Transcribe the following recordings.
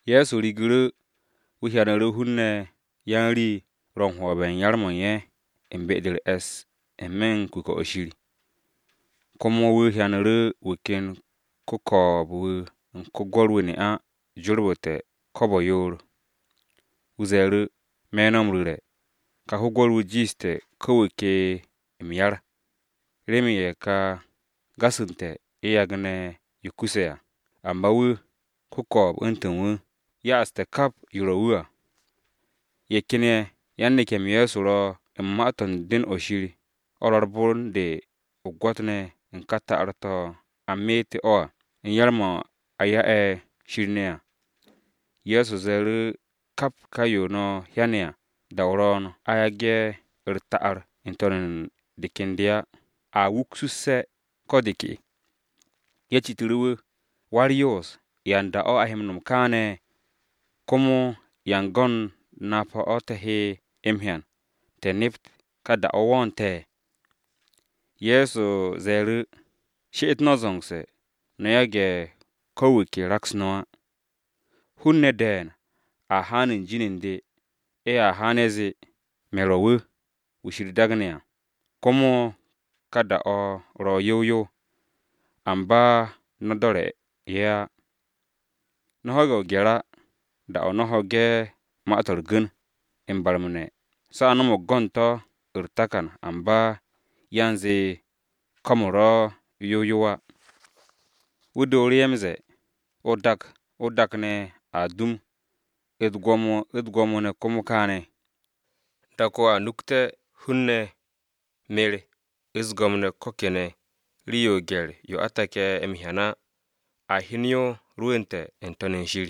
Ye̱so rigu̱ru̱ wu̱ hyanu̱ru̱ hun-ne̱ yan-rii ro̱ u̱n hwo̱be̱ u̱n yar-mo̱ u̱n ye̱ u̱n be-de u̱r-e̱ss n-me̱ u̱n Pyo-o̱ Shir. Komo wu̱ hyanu̱ru̱ wu̱ ken ko-ko̱o̱b-wu̱ u̱n ko-gwo̱r-wu̱ ne'a jorbu̱te̱ ne̱ra yoor. Wu̱ ze̱e̱ru̱, “Me̱ no̱ m-ru̱re̱, kà ko-gwo̱r-wu̱ jiishte̱ ko̱ wu̱ ke m-yar, remen ye̱ ka gasu̱nte̱ ye̱ yagne̱ yo kuse̱ à, amba wu̱, ko-ko̱o̱b u̱ntu̱n wu̱, ya'aste̱ kap yo ro̱ wu̱ à.” Ye̱ ken ye̱ yan-neke̱-m Ye̱so ro̱ u̱n ma-to̱ u̱n Pyo-o̱ Shir, o̱ ro̱ u̱r-bon de o-gwo̱t ne̱ u̱n ka ta'ar-to̱ a meete̱ o̱ à u̱n yar-mo̱ a ya'e̱ Shir ne̱ à. Ye̱so ze̱e̱ru̱, “Kap ka yo no̱ hyane̱ à, da-o ro̱o̱n a yage̱ u̱r-ta'ar n-to̱n u̱n de ken de á, a wuksusse̱ ko de ke.” Ye̱ citu̱ru̱ wu̱, “Wa-u̱r-Yoos, ¿ya u̱n da-o̱ a he m-no̱m kaane̱? Komo ¿ya u̱n go̱n napa-o̱ te̱ he m-hyan, te̱ nept ka da-o̱ wo̱o̱nte̱?” Ye̱so ze̱e̱ru̱, “She'et no̱ zo̱ngse̱, no̱ yage̱ ko̱ wu̱ ke raks no̱ á. Hun-ne̱ de̱e̱n a haan u̱n jin u̱n de. Ye̱a haan, ye̱ zee, ‘Me̱ ro̱ wu̱, wu̱ Shir daagne̱ à!’ Komo, ‘Ka da-o̱ ro̱ yow yow!’ Amba no̱ do̱re̱ ye̱ á. No̱ ho̱ge̱ o-gye̱r á, da-o̱ no̱ ho̱ge̱ ma-to̱ u̱r-gu̱n, m-barme̱ ne̱, se̱ a no̱mo̱g go̱n to̱ u̱r-takan, amba yan zee ko̱m-u̱r ro̱ yow yow á.” Wu̱ dooru̱ ye̱ m-ze̱e̱, “O-dak, o-dak ne̱ a dum, u̱t-gwo̱mo u̱t-gwo̱mo ne̱ komo kaane̱. Dak-o a nukte̱ o̱ ho hun-ne̱, me̱r, u̱s-go̱m ne̱ ko̱ kene̱, rii-yo o-gye̱r yo a take̱ m-hyan á, a hyen yo rwu̱nte̱ n-To̱n u̱n shir.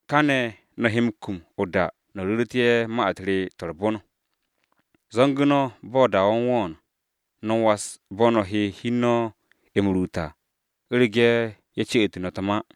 Kane̱ no̱ he m-kum o-da no̱ ru̱ru̱tu̱ ye̱ ma-u̱t re to̱ u̱r-bon. Zo̱ngu̱ no̱ ba da-o̱ u̱n wo̱o̱n, no̱ was bo̱ no̱ he hi u̱n no̱ m-ruut á, u̱rege̱ ye̱ ce'u̱tu̱ no̱ u̱t-ma.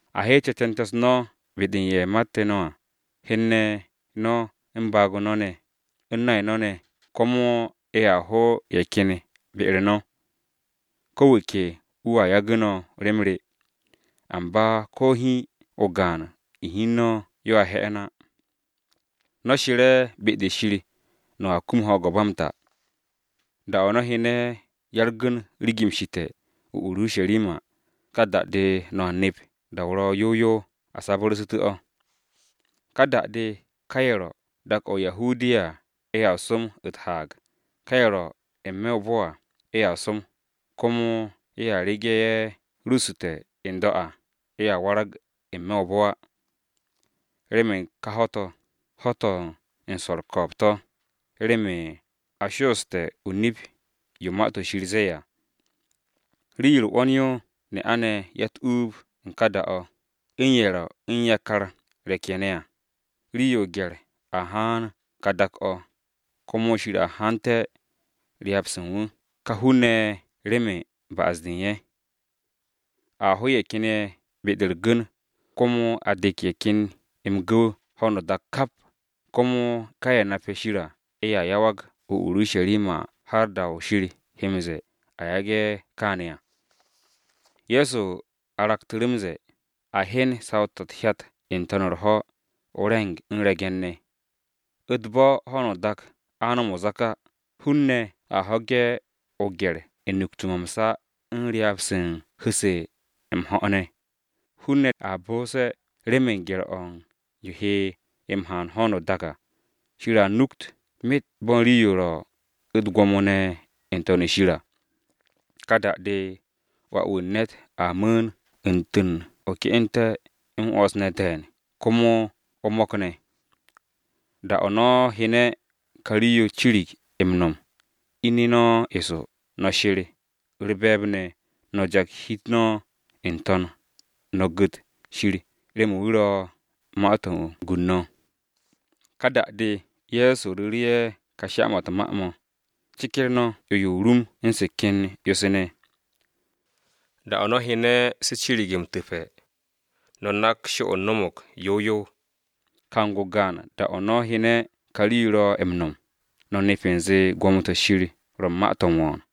A heet ce̱te̱nte̱-u̱s no̱ be-de u̱n ye̱ mate̱ no̱ à, hen-ne̱ no̱ u̱n baag-o no̱ ne̱, u̱n nay no̱ ne̱ ne̱, komo ye̱a ho ye̱ ken ye̱ be-u̱r no̱. Ko̱ wu̱ ke wu̱a yagu̱ no̱ rem re. Amba ko̱ o-hi o-gaan u̱n hi u̱n no̱ yoa he̱'e̱n á. No̱ she̱re̱ be-de Shir no̱a kum ho̱o̱g-o̱ ba m-ta. “Da-o no̱ hyene̱ ya-u̱r-gu̱n rigimsu̱te̱ o-Urusharima, ka da-de no̱a nep da-o ro̱ yow yow a sabu̱rsu̱te̱ o̱. Ka da-de ka ye̱ ro̱ u̱n dak-o̱ o-Judiya ye̱ som u̱t-haag, ka ye̱ ro̱ n-me̱ o-bo̱ à, ye̱ som, komo ye̱ rege̱ ye̱ ruuste̱ n-do̱ à, ye̱ warag n-me̱ o-bo̱ á. Remen ka ho̱-to̱, ‘Ho̱-to̱ u̱n swo̱ u̱r-ko̱o̱b to̱,’ remen a sho'oste̱ o-nip yo Ma-to̱ Shir zee à. Rii-yo u̱r-'wo̱n yo ne'a-ne̱ ya-u̱t-uub u̱n ka da-o, u̱n ye̱ ro̱ u̱n yakar re̱k-ye̱ ne̱ à! Rii-yo o-gye̱r a haan u̱n ka dak-o̱, komo Shir a hante̱ ryaab-se u̱n wu̱ u̱n ka hun-ne̱ ye̱ remen ba'as-de u̱n ye̱. A ho ye̱ ken ye̱ be-de u̱r-gu̱n, komo a dek ye̱ ken ye̱ m-gu̱w ho̱no o-dak kap, komo ka ye̱ nape̱ Shir á ye̱a yawag o-Urusharima har da-o Shir he m-ze̱e̱ ye̱ yage̱ kaane̱ à.” Ye̱so aragtu̱ru̱ m-ze̱e̱, “A hyen saw-to̱ u̱t-hyat n-to̱n u̱r-ho̱, o-re̱ng u̱n re̱ge̱n-ne̱. U̱t-bo̱ ho̱no o-dak a no̱m o-zak á, hun-ne̱ a ho̱ge̱ gye̱r-o̱ u̱n nukte̱-mo̱ m-sa u̱n ryaab-se u̱n a hu̱-se m-ho̱ ne̱. Hun-ne̱ a bonse̱ remen gye̱r-o̱ u̱n yo he m-haan ho̱no o-dak à, Shir a nukt myet bo̱ u̱n rii-yo ro̱ u̱t-gwo̱mo ne̱ n-To̱n u̱n shir à. Ka da-de Wà-wu̱ u̱n ne̱t a mu̱u̱n, u̱ntu̱n o-ke'ente̱ m-'wo̱ns ne̱ de̱e̱n, komo o-mo̱k ne̱. Da-o̱ no̱ hyene̱ ka rii-yo cirig m-no̱m, ine̱ no̱ eso no̱ she̱r u̱r-be̱e̱b ne̱ no̱ jaks hi-u̱t no̱ n-To̱n, no̱ gu̱t Shir remen wu̱ ro̱ ma-to̱ u̱n gu u̱n no̱.” Ka da-de Ye̱so ru̱ru̱ ye̱ sha-mo̱ u̱t-ma: “Ceker no̱ 'yo-yo o-rum u̱n se̱ ken 'yo-se ne̱. Da-o̱ no̱ hyene̱ se̱ cirig m-tu̱pe̱, no̱ nak sho-o no̱mo̱g yow yow. Kang-o gaan, da-o̱ no̱ hyene̱ ka rii-yo ro̱ m-no̱m, no̱ nep u̱nze gwo̱mo-to̱ Shir ro̱ ma-to̱ m-wo̱o̱n.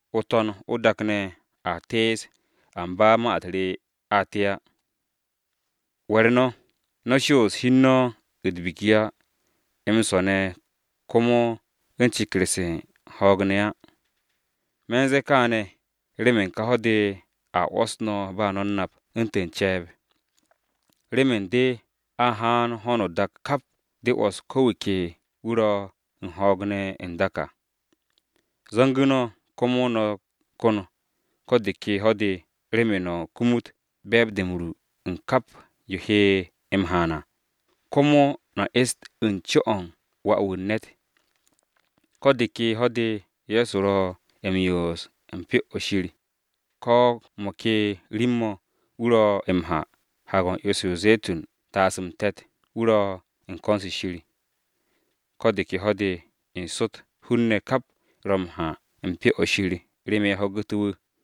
O-To̱n o-dak ne̱ a tees, amba ma-u̱t re a te á. “We̱r no̱! No̱ shoos hi u̱n no̱ u̱t-biki á, m-swo̱ ne̱ komo u̱n ceker-se u̱n ho̱o̱g ne̱ á. Me̱ u̱n zee kaane̱ remen ka ho̱-de a 'wo̱s no̱ ba no̱ u̱n nap u̱ntu̱n ce̱e̱b. Remen de a haan ho̱no o-dak kap de 'wo̱s ko̱ wu̱ ke wu̱ ro̱ u̱n ho̱o̱g ne̱ n-dak à. Zo̱ngu̱ no̱, komo no̱ ko̱n ko̱ de ke ho̱-de, remen no̱ kumut be̱e̱b-de m-ru u̱n kap yo he m-haan à, komo no̱ est u̱n co-o u̱n Wà-wu̱ u̱n ne̱t.” Ko̱ de ke ho̱-de Ye̱so ro̱ m-yoos u̱n Pyo-o̱ Shir, ko̱ mo̱ ke rim-mo̱ wu̱ ro m-ha Haag-o̱ u̱n 'yo-se o-Ze̱tun taasu̱ m-te̱t wu̱ ro u̱n ko̱n-se Shir. Ko̱ de ke ho̱-de n-sot hun-ne̱ kap ro̱ m-ha u̱n Pyo-o̱ Shir, remen ye̱ ho̱gu̱té̱ wu̱.